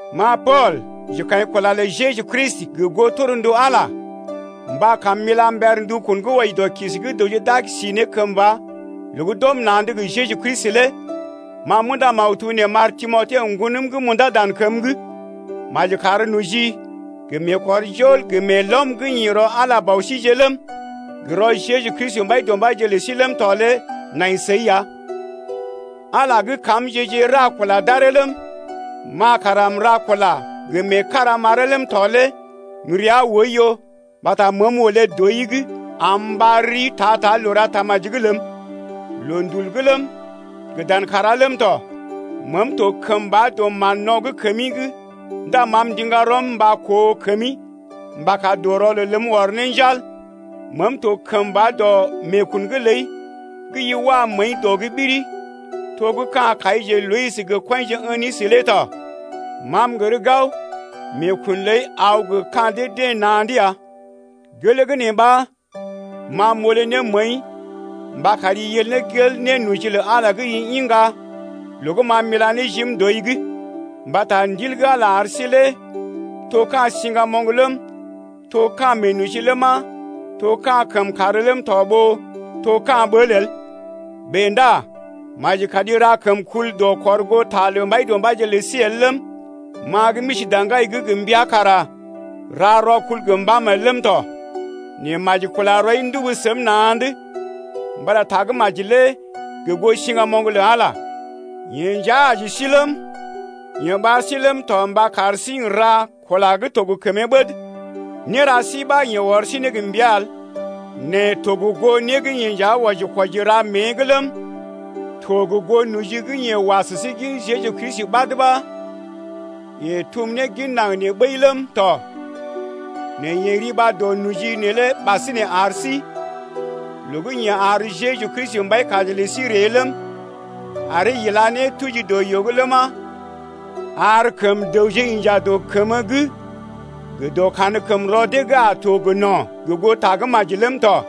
Ma Pool, njekaḭkula lə Jeju Kristi gə goo torndu Ala, mba kam m’ila mber ndukun gə́ wɔji dɔ kisi gə́ dəwje d’a si ne kəmba loo gə́ d’ɔm na̰’d gə Jeju Kristi lé ma m’unda maktub nee m’ar Timote, ŋgonəm gə́ m’undá dan kəm’g. Maji kar noji gə meekɔrjol gə meelɔm gə́ ḭ rɔ Ala Bɔ síje’g ləm, gə rɔ Jeju Kristi Mbaidɔmbaije’g lə sí ləm tɔ lé nai səi ya! Ala gə́ kamje-je ra kula d’aree ləm, ma kara m’ra kula gə meekara m’aree ləm tɔ lé m’rəa oiyo mbata məəm olé dɔi’g am m’ɓar rii ta-ta loo ra tamaji’g ləm, loondul’g ləm, gə dan kàrá ləm tɔ. Meem to kəmba dɔ mán-no̰ gə́ kəmi’g ndá ma m’ndiŋga rɔm mba koo kəmi mba kar dɔ rɔlel ləm ɔr ne njal. Meem to kəmba dɔ meekun’g ləi gə́ i wa məəi dɔ’g ɓiri to gə́ ka̰ kaije Loyis gə kɔinje Enisə lé tɔ. Ma m’gər gao meekun ləi aw gə ka̰ dee-deḛ na̰’d ya. Gelee gə́ nee ɓa ma m’olé ne məəi mba kari yel ne gel nénoji lə Ala gə́ i iŋga loo gə́ ma m’ila ne jim dɔi’g. Mbata ndil gə́ Ala ar sí lé to ka̰ siŋgamoŋ ləm, to ka̰ meenoji ləma, to ka̰ kəmkàr ləm tɔ ɓó to ka̰ ɓəl el. Bèe ndá maji kari ra kəmkul dɔ kɔr goo ta lə Mbaidɔmbaije lə sí el ləm, ma gə́ m’isi daŋgai’g gə mbəa kara ra rɔkul gə mbàm el ləm tɔ. Nɛ maji kula rɔi ndubu səm na̰’d mbata Tagə́maji lé gə goo siŋgamoŋ lə Ala ya. Yeḛ nja aji sí ləm, yeḛ ɓar sí ləm tɔ mba kar sí n’ra kula gə́ to gə kəmee ɓəd. Néra sí ɓa, yeḛ ɔr sí ne gə mbəa el nɛ to gə goo né gə́ yeḛ nja wɔji-kwɔji mée’g ləm, to gə goo noji gə́ yeḛ wa sə sí gin Jeju Kristi ɓad ɓa yeḛ tum ne gin naŋg nee ɓəi ləm tɔ. Nɛ yeḛ riba dɔ noji neelé ɓasinè ar sí loo gə́ yeḛ ar Jeju Kristi Mbaikaji lə sí ree ləm, aree ila ne tuji dɔ yoo’g ləma, ar kəm dəwje inja dɔ kəmə’g gə dɔ kankəmrɔ dee gə́ a to gə no̰ gə goo Tagə́maji ləm tɔ.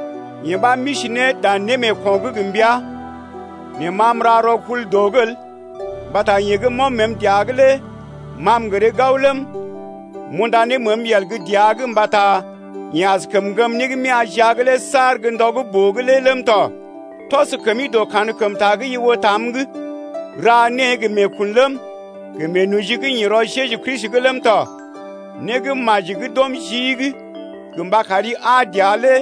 Yee ɓa, m’isi ne dan némeeko̰’g gə mbəa. Nɛ ma m’ra kəmkul dɔ’g el mbata yeḛ gə́ m’ɔm məəm dəa’g lé ma m’gəree gao ləm, m’unda ne məəm yel gə́ dəa’g mbata yeḛ askəm ŋgəm né gə́ m’ya̰ jia’g lé saar ndɔ gə́ boo’g lé ləm tɔ. Tɔs kəmi dɔ kankəmta gə́ i oo tam’g, ra née gə meekun ləm, gə meenoji gə́ ḭ rɔ Jeju Kristi’g ləm tɔ. Né gə́ maji gə́ d’ɔm jii’g gə mba kari aa dəa lé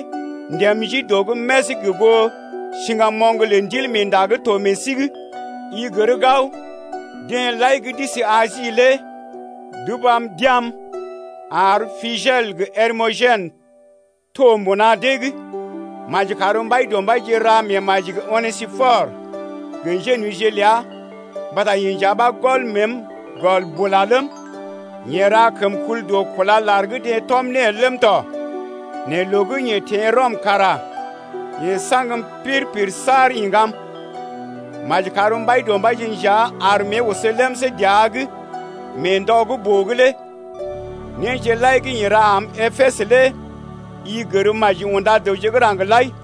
ndém ji dɔ’g més gə goo siŋgamoŋ lə Ndilmeenda gə́ to meḛ sí’g. I gər gao, deḛ lai gə́ d’isi Asi lé d’ubam d’ya̰’m ar Pigelə gə Hermogenə to mbuna dee’g. Maji kar Mbaidɔmbaije ra meemaji gə Onesipɔrə gə njénojije ləa mbata yeḛ nja ɓa gɔl məəm gɔl bula ləm, yeḛ ra kəmkul dɔ kúla lar gə́ deḛ tɔm ne el ləm tɔ. Nɛ loo gə́ yeḛ teḛ Rɔm kara yeḛ saŋgəm pir-pir saar iŋgam. Maji kar Mbaidɔmbaije nja ar mée oso lemsé dəa’g mee ndɔ gə́ boo’g lé. Néje lai gə́ yeḛ ra am Epesə lé i gər maji unda dəwje gə́ raŋg lai.